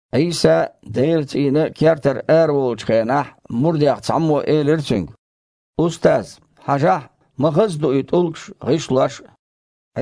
Іийса Делан цІийнан кертара араволучу хенахь мурдех цхьаммо элира Цуьнга: «Устаз! Хьажахь, ма хаза ду и тІулгаш а, гІишлош а!»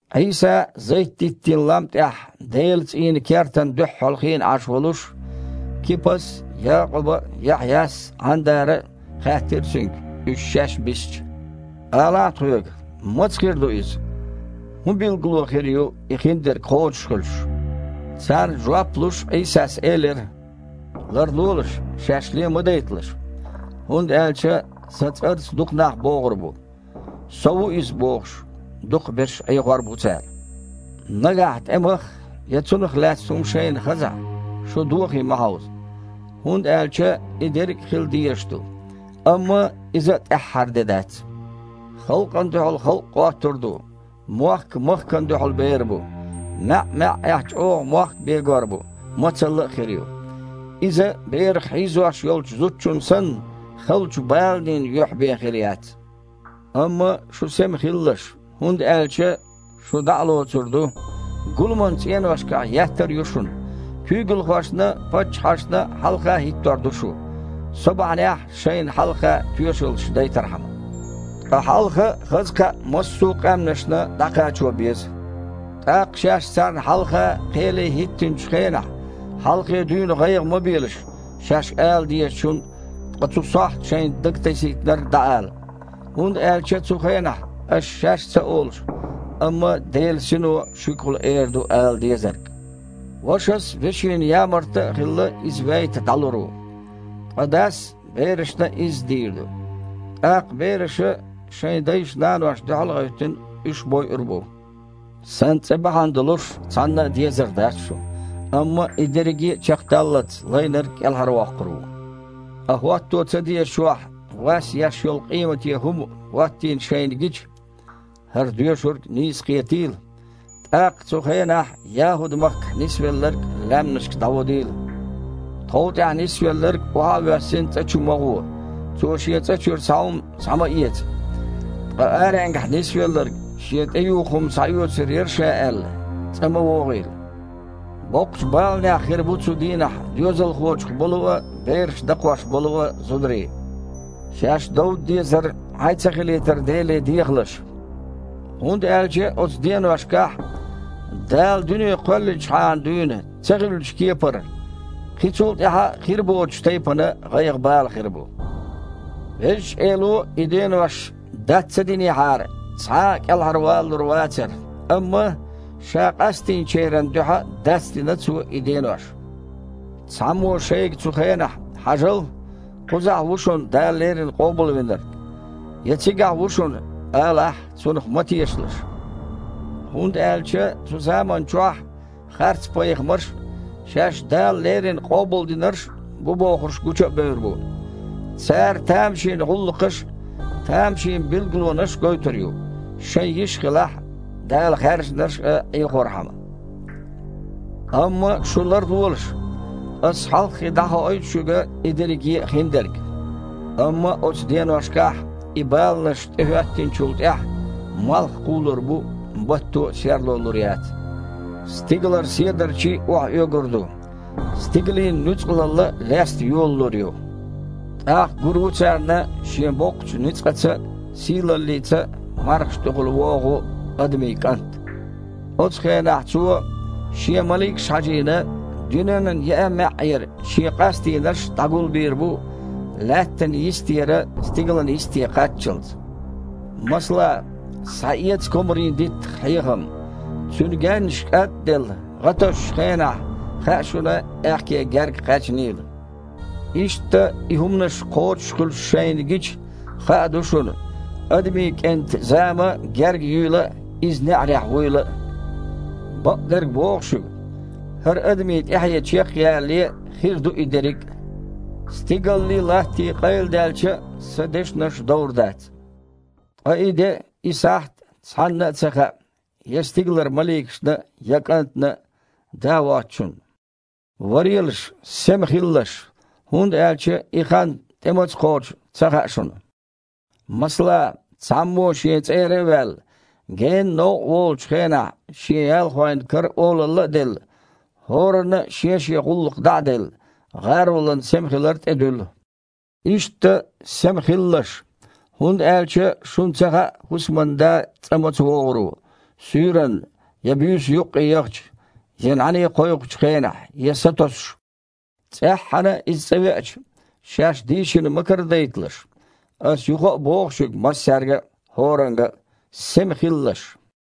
Іийса Зайт-диттийн лам тІехь Делан цІийнан кертана дуьххьал хиъна Іаш волуш, Кипас а, Якъуба а, Яхьъяс а, Іандара а хаьттира Цуьнга, уьш шаьш бисча: «Алахь тхоьга, маца а хир ду иза, хІун билгало а хир ю и хиндерг кхочуш хуьлуш?» Царна жоп а луш, Іийсас элира: «Ларлолаш, шаьш ле ма дайталаш, хІунда аьлча Сан цІарца дукха нах богІур бу. „Со ву Иза“, – бохуш, дукхахберш Іехор бу цара. Нагахь тІемах я цунах лаьцна хІума шайна хазахь, шу дохий ма хьовза, хІунда аьлча и дерриг а хила дезаш ду. Амма иза а тІаьххьара де дац. Халкъана дуьхьал халкъ гІоттур ду, мохк махкана дуьхьал бер бу. МаьІ-маьІІехь чІогІа мохк бегор бу, мацалла а хир ю. Иза, берах хьийзош йолчу зудчун санна, халчу баланийн юьхь бен хир яц. Амма шу сема хилалаш, хІунда аьлча шу дІа а лоьцур ду, гуламан цІеношкахь еттар а ю шуна, куьйгалхошна а, паччахьашна а хьалха хІиттор а ду шу, Со бахьанехь шайна хьалха тоьшаллаш дайтархьама. Ткъа хьалха хаза кхаъ массо а къаьмнашна дІакхачо беза. ТІаккха, шаьш царна хьалха кхеле хІиттинчу хенахь, хьалхе дуьйна гІайгІа ма белаш, шаьш ала дезачун, ткъа цу сохьта шайна дага тасийтинарг дІаала. ХІунда аьлча цу хенахь аш шаьш а ца олуш, амма Делан Сино шуьгахула эр ду ала дезарг». «Вашас, вешина ямарта а хилла, иза вейта дІалур ву. Ткъа дас берашна а изза дийр ду. ТІаккха бераша, шайн дайшна-наношна дуьхьал а гІевттина, уьш бойур а бу. Сан цІе бахьана долуш цхьанна а дезар дац шу, амма и дерриге а чекхдаллалц лайнарг кІелхьарвоккхур ву». «Ткъа хІотто ца дезачохь, „вас еш йолу къемате хІума“ хІоттийна шайна гича (хІара доьшург нийса кхетийла!), тІаккха цу хенахь ЯхІуд-махкахь нисвелларг лаьмнашка дІаводийла. Тхов тІехь нисвелларг, охьа а воьссина цІа чу ма гІо, цо шен цІа чуьра цхьа хІума схьа ма эца. Ткъа аренгахь нисвелларг, шен тІеюху хІума схьаоьцур яра ша аьлла, цІа ма вогІийла. Боккхачу баланехь хир бу цу дийнахь доьзалхочух болу а, бераш дакхош болу а зударий. Шаьш довда дезар Іай ца хилийтар Деле дехалаш. ХІунда аьлча оцу деношкахь, Дала дуьне кхоьллинчхьана дуьйна ца хиллачу кепара, кхин цул тІаьхьа а хир боцучу тайпана гІайгІа-бала хир бу. Везачу Эло и денош дац ца динехьара, цхьа а кІелхьарвалалур вацара, амма Ша къастийначеран дуьхьа дацдина Цо и денош. Цхьаммо шайга цу хенахь „Хьажал! Кхузахь ву шуна Дала леррина Къобалвинарг!“ я „Цигахь ву шуна!“ алахь, цунах ма тешалаш, хІунда аьлча цу заманчохь харцпайхамарш а, шаьш Дала леррина къобалдинарш бу бохурш а гучубевр бу. Цара тамашийна гІуллакхаш а, тамашийна билгалонаш а гойтур ю, шайн йиш хилахь, Дала хаьржинарш а Іехорхьама. Амма шу ларлолаш! Ас хьалххе дІахоуьйту шуьга и дерриге а хиндерг». «Амма оцу деношкахь, и баланаш тІехІоьттинчул тІаьхьа, „малх кхулур бу, батто а серло лур яц, стигалара седарчий а охьаоьгур ду, стигалийн нуьцкъалалла а леста йолалур ю“». «ТІаккха гур ву царна Шен боккхачу ницкъаца а, сийлаллица а мархаш тІехула вогІу Адамийн КІант. Оцу хенахь Цо, Шен маликаш а хьажийна, дуьненан еъа а маьІІера Шен къастийнарш дІагулбийр бу лаьттан йистера стигалан йисте кхаччалц». «Масала, схьаэца комарийн диттах хьехам: цуьнан гаьннаш кІад а делла, гІа тосучу хенахь, хаьа шуна аьхке герга кхаьчнийла. Иштта, и хІуманаш кхочушхуьлуш шайна гича, хаа ду шуна Адамийн КІентан зама герга юйла а, Иза неІарехь вуйла а. Бакъдерг боху шуьга: ХІара адамийн тІаьхье чекхъялале хир ду и дерриг а. Стигаллий, латтий къайладаьлча а, Сан дешнаш довр дац». «Ткъа и де а, и сахьт а цхьанна а ца хаьа, я стигалара маликашна а, я КІантана а, Да воцучунна. Варелаш, сема хилалаш, хІунда аьлча и хан тІе маца кхочу ца хаьа шуна. Масала, цхьаммо шен цІера а ваьлла, генна новкъа волучу хенахь, шен ялхойн кара олалла а делла, хІоранна а шен-шен гІуллакх дІа а делла, гІаролана сема хилар тІедуьллу. Иштта сема хилалаш! ХІунда аьлча шуна ца хаьа хІусаман да цІа маца вогІур ву, суьйранна, я буьйса юккъе яхача, я нІаьний кхойкхучу хенахь, я сатосуш. ЦІеххьана иза цІа веача, шаьш дийшина ма карадайталаш. Ас юха а боху шуьга массаьрга а, хІоранга а: „Сема хилалаш!“»